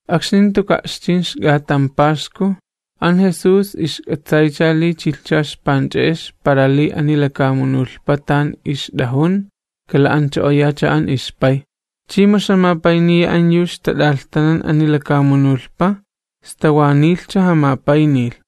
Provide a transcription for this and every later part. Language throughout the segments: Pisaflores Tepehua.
Akxni jantuka' ixchin ixk'atan Paxku, an Jesús ixk'atsaycha li chilhcha ixpanch'e'ex para li ani lakamunulhpa tan ixt'ajun kala'ancho'oyacha an ixPay, chi mu ixjamapayniya an yu ixtat'alhtanan ani lakamunulhpa, sta wa nilhcha jamapaynilh.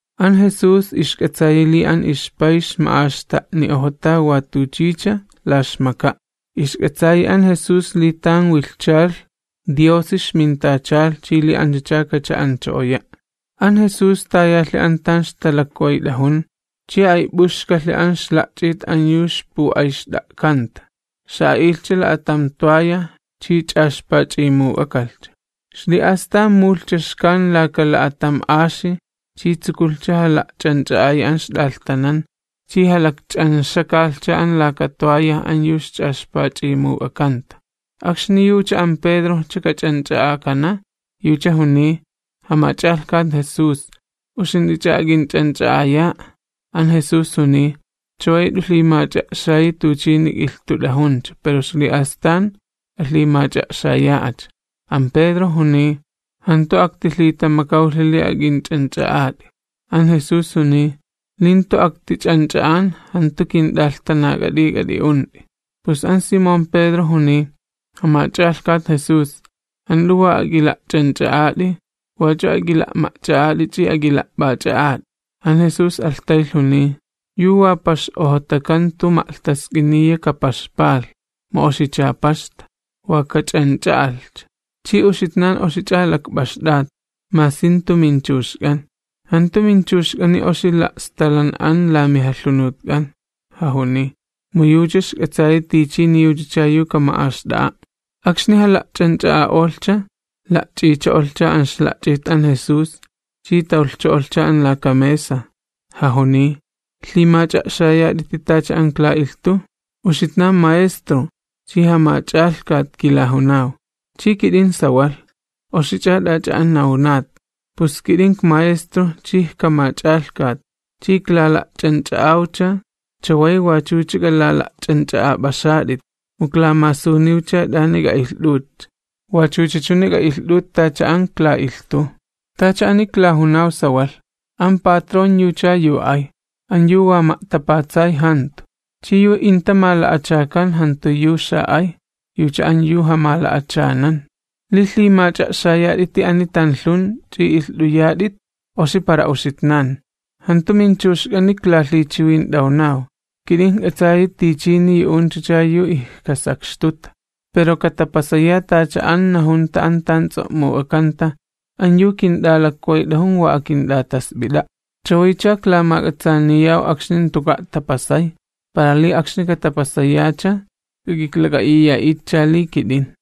An Jesús ixk'atsayi li an ixPay ixma'axta'ni'ojota wa tuchicha la ixmaka'. Ixk'atsayi an Jesús li tan wilhchalh Diosi ixmintachalh chi li anchacha kacha'ancho'oya'. An Jesús tayalhi an tan ixtalakwayt'ajun, chi ayp'uxkalhi an ixla'ch'it an yu ixpu'ayxt'a'kanta. Xa'a'ilhcha la'atam toalla chi ch'axpach'imuk'akalhcha. Ixli'astan mujulhcha xkan laka la'atam axi, chi tsukulhcha jala'ch'anch'a'ayi an ixt'alhtanan chi jalakch'anxakalhcha an laka toalla an yu ixch'axpach'imuk'akanta. Akxni yucha an Pedrojcha kach'anch'a'akana, yucha juniy: ―Jamach'alhkat Jesús, ¿uxint'ich'a ak'inch'anch'a'aya'a? An Jesús juniy: ―Chaway jant'u lhimach'a'xayi tuchini ik'ilhtut'ajuncha, pero ixli'astan k'alhimach'a'xaya'acha. An Pedro juniy: ―¡Jantu aktilhitamakawlhi li ak'inch'anch'a'at'i! An Jesús juniy: ―Li jantu aktich'anch'a'an, jantu kint'alhtanak'at'i k'at'i'unt'i. Pus an Simón Pedro juniy: ―Jamach'alhkat Jesús, jant'u wa ak'ila'ch'anch'a'at'i, wach'u ak'ila'ma'ch'a'at'i ch'i ak'ila'p'ach'a'at'i. An Jesús alhtaylh juniy: ―Yu wa pax'ojotaka jantu ma'lhtask'iniya kapaxpalh, mu oxicha paxta, wa kach'anch'a'alhcha. Chi uxitnan oxich'a lakp'axt'at, masi jantu minchuxk'an. “Jantu minchuxk'ani oxicha la'stalan'an la mijalhunutk'an,” jajuniy, mu yucha ixk'atsayi tichini yuchacha yu kama'axt'a'a'. Akxni jala'ch'anch'a'a'olhcha, la'ch'icho'olhcha an ixla'ch'it an Jesús, chi tawlhcho'olhcha an laka mesa, jajuniy: ―¿Lhimach'a'xayat'iti tacha an ikla'ilhtuw? Uxitnan Maestro chi Jamach'alhkati kilajunaw, chi kit'in sawalh, oxich'a t'ach'a an nawnat. Pus kit'in ikMaestro chi ikJamach'alhkat, chi iklala'ch'anch'a'awcha, chaway wach'uch'a k'alala'ch'anch'a'ap'axat'it. Mu iklamasuniwcha t'ani k'a'ilht'utcha, wachucha chuni k'a'ilht'ut tacha an ikla'ilhtuw. Tacha ani iklajunaw sawalh, an patrón yucha yu ay, an yu wa ma'tapatsay jantu, chi yu inta mala'achakan jantu yu xa'ay, yucha an yu jamala'achanan. Li lhimach'a'xayat'iti ani tanlhun ch'i ilht'uyat'it, oxi para uxitnan. ’Jantu minchuxk'ani iklalhichiwint'awnaw, kit'in ijk'atsayi tichini yu'unchacha yu ijkasakxtuta. Pero katapasaya tacha an najunta an tan ts'o'muk'akanta: “An yu kint'alakwayt'ajun wa akint'atasp'it'a'.” Chawaycha iklamak'atsaaniyaw akxni jantuka' tapasay, para li akxni katapasayacha k'ak'iklak'a'iya'itcha li kit'in.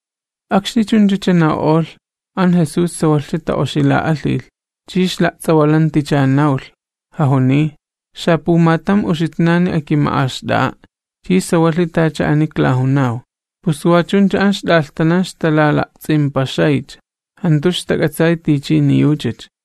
Akxni chunchacha naw'olh, an Jesús sawalhcha ta'oxila'alhilh, chi ixla'ts'awalanticha nawlh, jajuniy: ―Xapumatam uxitnani akima'axt'a'a', chi sawalhi tacha ani iklajunaw. Pus wa chuncha an ixt'alhtanan ixtalala'ts'impaxaycha, jantu ixtak'atsay tichini yuchacha.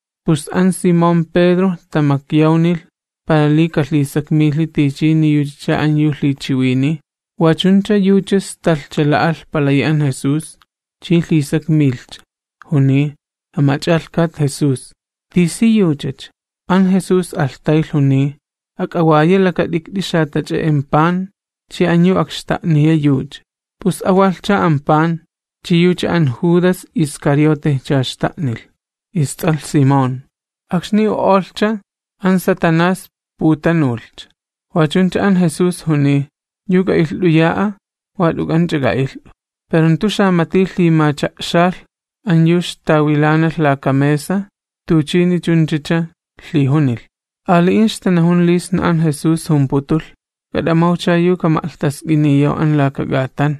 pus an Simón Pedro tamakyawnilh, para li kalhisakmilhi tichini yuchacha an yu lhichiwiniy. Wa chuncha yucha stalhcha la'alh palayi an Jesús, chi lhisakmilhcha, juniy: ―Jamach'alhkat Jesús, ¿tisiyuchacha? An Jesús alhtaylh juniy: ―Ak'awaya lakat'ikt'i xatach'e'en pan, chi an yu akxta'niya yucha. Pus awalhcha an pan, chi yucha an Judas Iscariotejcha xta'nilh, ists'alh Simón. Akxni u'olhcha, an Satanás putanulhcha. Wa chuncha an Jesús juniy: ―Yu k'a'ilht'uya'a, wa t'uk'anch'a k'a'ilht'u. Pero jantu xamati lhimacha'xalh an yu ixtawilanalh laka mesa tuchini chunchacha lhijunilh. Ali'in ixtanajun li sna an Jesús jumputulh: “K'at'amawcha yu kama'lhtask'iniyaw an laka k'atan”,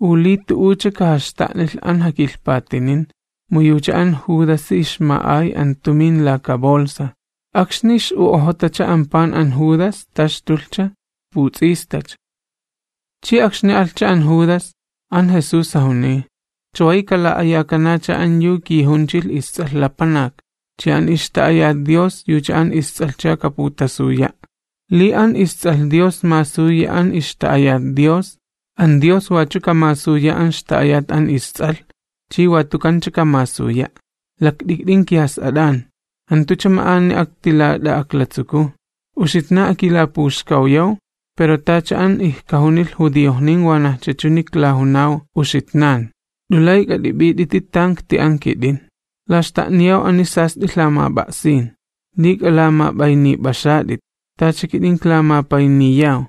u li tu'ucha kajaxta'nilh an jakilhpatinin, mu yucha an Judasi ixma'ay an tumin laka bolsa. Akxni ix'u'ojotacha an pan an Judas, taxtulhcha, puts'istacha. Chi akxni alhcha an Judas, an Jesús jajuniy: ―Chaway kala'ayakanacha an yu kijunchilh isTs'alh Lapanak, chi an ixta'ayat Dios yucha an isTs'alhcha kaputasuya'. Li an isTs'alh Dios masuyi an ixta'ayat Dios, an Dios wachu kamasuya an ixta'ayat an isTs'alh, chi watukancha kamasuya'. Lakt'ikt'in kijas'at'an, jantucha ma'ani aktilat'a'aklatsukuw. Uxitnan akilapuxkawyaw, pero tacha an ijkajunilh judiojnin wanajcha chuni iklajunaw uxitnan: Jant'u lay k'at'ip'it'iti tan ikti'an kit'in. Iklaxta'niyaw ani sast'i lhamap'a'sin: Li k'alamap'aynip'axat'it. Tacha kit'in iklamapayniyaw.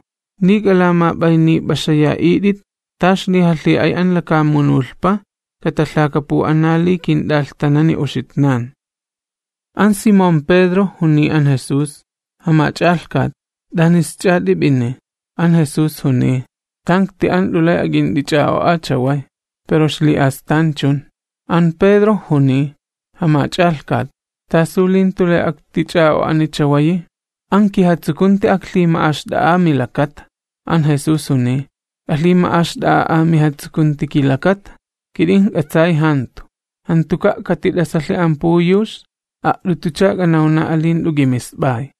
Li k'alamap'aynip'axaya'it'it, ta ixlijalhi'ay an lakamunulhpa katalhakapu'ana li kint'alhtanani uxitnan. An Simón Pedro juniy an Jesús: ―Jamach'alhkat, ¿t'anisch'a t'ip'ini? An Jesús juniy: ―Tan ikti'an jant'u lay ak'int'ich'a'o'a chaway, pero ixli'astan chun. An Pedro juniy: ―Jamach'alhkat, ¿tasu li jantu lay aktich'a'o'ani chawayi? ¡An kijatsukunti aklhima'axt'a'a milakata! An Jesús juniy: ―¿K'alhima'axt'a'a'a mijatsukunti kilakata? Kit'in sawalhi yu ijkunan, jantuka' katit'asalhi an puyux, a't'utucha k'anawna'a li jant'u k'imisp'ay.